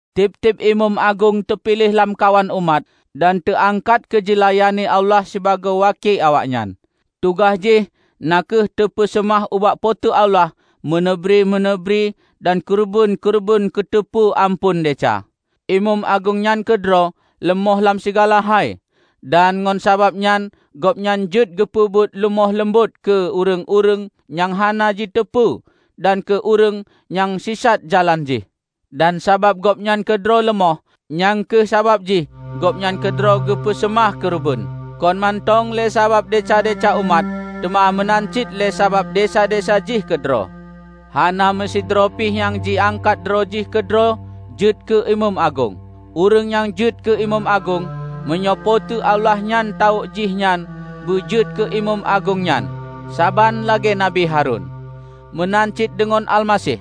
Tieb-tieb imeum agong teupiléh lamkawan umat, dan teuangkat keujilayani Allah sibagoe waki awaknyan. Tugaih jih na kheueh teupeuseumah ubak Po teu Allah meuneubri-meuneubri dan keureubeuen-keureubeuen keuteupeu amphon desya. Imeum agong nyan keudroe leumoh lam sigala hai, dan ngon sabab nyan gobnyan jeuet geupeubuet leumoh leumbot keu ureuëng-ureuëng nyang hana jiteupeu dan keu ureuëng nyang sisat jalan jih. Dan sabab gobnyan keudroe leumoh, nyang kheueh sabab jih gobnyan keudroe geupeu seumah keureubeuen, kon mantong lé sabab desya-desya umat, teuma meunan cit lé sabab desya-desya jih keudroe. Hana meusidroe pi nyang jiangkat droe jih keudroe jeuet keu imeum agong. Ureuëng nyang jeuet keu imeum agong, meunyoe Po teu Allah nyang tawök jih nyan beujeuet keu imeum agong nyan -- saban lagée Nabi Harun. Meunan cit deungon Almaseh.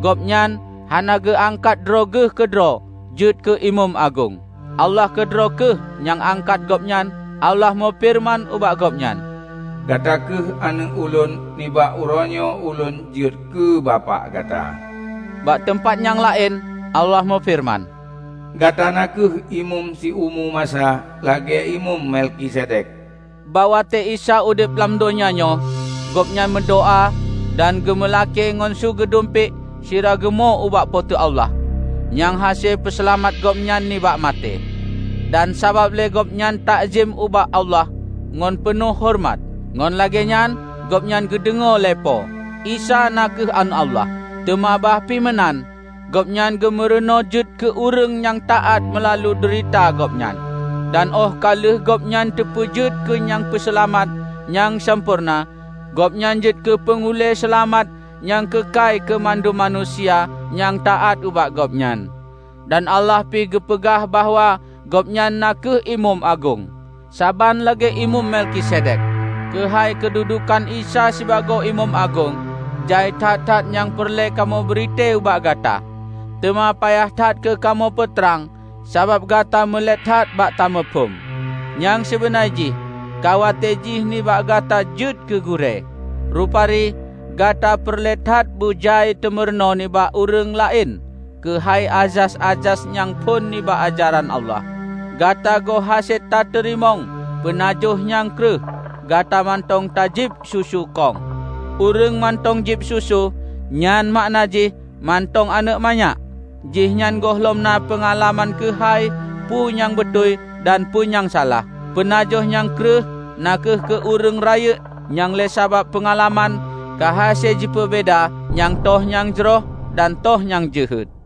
Gobnyan hana geuangkat droe Geuh keudroe jeuet keu Imeum Agong. Allah keudroe kheueh nyang angkat Gobnyan. Allah meufeureuman ubak Gobnyan, "Gata kheueh Aneuëk Ulôn; nibak uroenyoe Ulôn jeuet keu Bapak Gata." Bak teumpat nyang laén Allah meufeureuman, "Gata na kheueh imeum siumu masa, lagée Imeum Melkisedek." Bak watée Isa udeb lam donya nyoe, Gobnyan meudoá dan geumeulakée ngon su geudumpék sira geumo ubak Po teu Allah, nyang hase peuseulamat Gobnyan nibak maté. Dan sabab lé Gobnyan takzem ubak Allah ngon peunoh horeumat, ngon lagée nyan Gobnyan geudeungoe lé Po. Isa na kheueh Aneuëk Allah, teuma bah pi meunan, Gobnyan geumeurunoe jeuet keu ureuëng nyang taát meulalu deurita Gobnyan. Dan óh ka lheueh Gobnyan teupeujeuet keu nyang peuseulamat nyang sampoereuna, Gobnyan jeuet keu panghulée seulamat nyang keukai keu mandum manusia nyang taát ubak Gobnyan, dan Allah pi geupeugah bahwa Gobnyan na kheueh Imeum Agong, saban lagée Imeum Melkisedek! Keuhai keududukan Isa sibagoe Imeum Agong, jai that-that nyang peureulée kamoe britée ubak gata, teuma payah that keu kamoe peutrang sabab gata mulet that bak tamuphom. Nyang sibeuna jih ka watée jih nibak gata jeuet keu gurée, rupari gata peureulée that beujai tameurunoe nibak ureuëng laén keuhai azas-azas nyang phon nibak ajaran Allah. Gata goh hase tateurimong peunajoh nyang kreueh; gata mantong tajieb susu kong. Ureuëng mantong jieb susu, nyan makna jih mantong aneuëk manyak; jihnyan gohlom na peungalaman keuhai peue nyang beutôi dan peue nyang salah. Peunajoh nyang kreueh na kheueh keu ureuëng rayeuk nyang lé sabab peungalaman, ka hase jipeubeda nyang toh nyang jroh dan toh nyang jeuhet.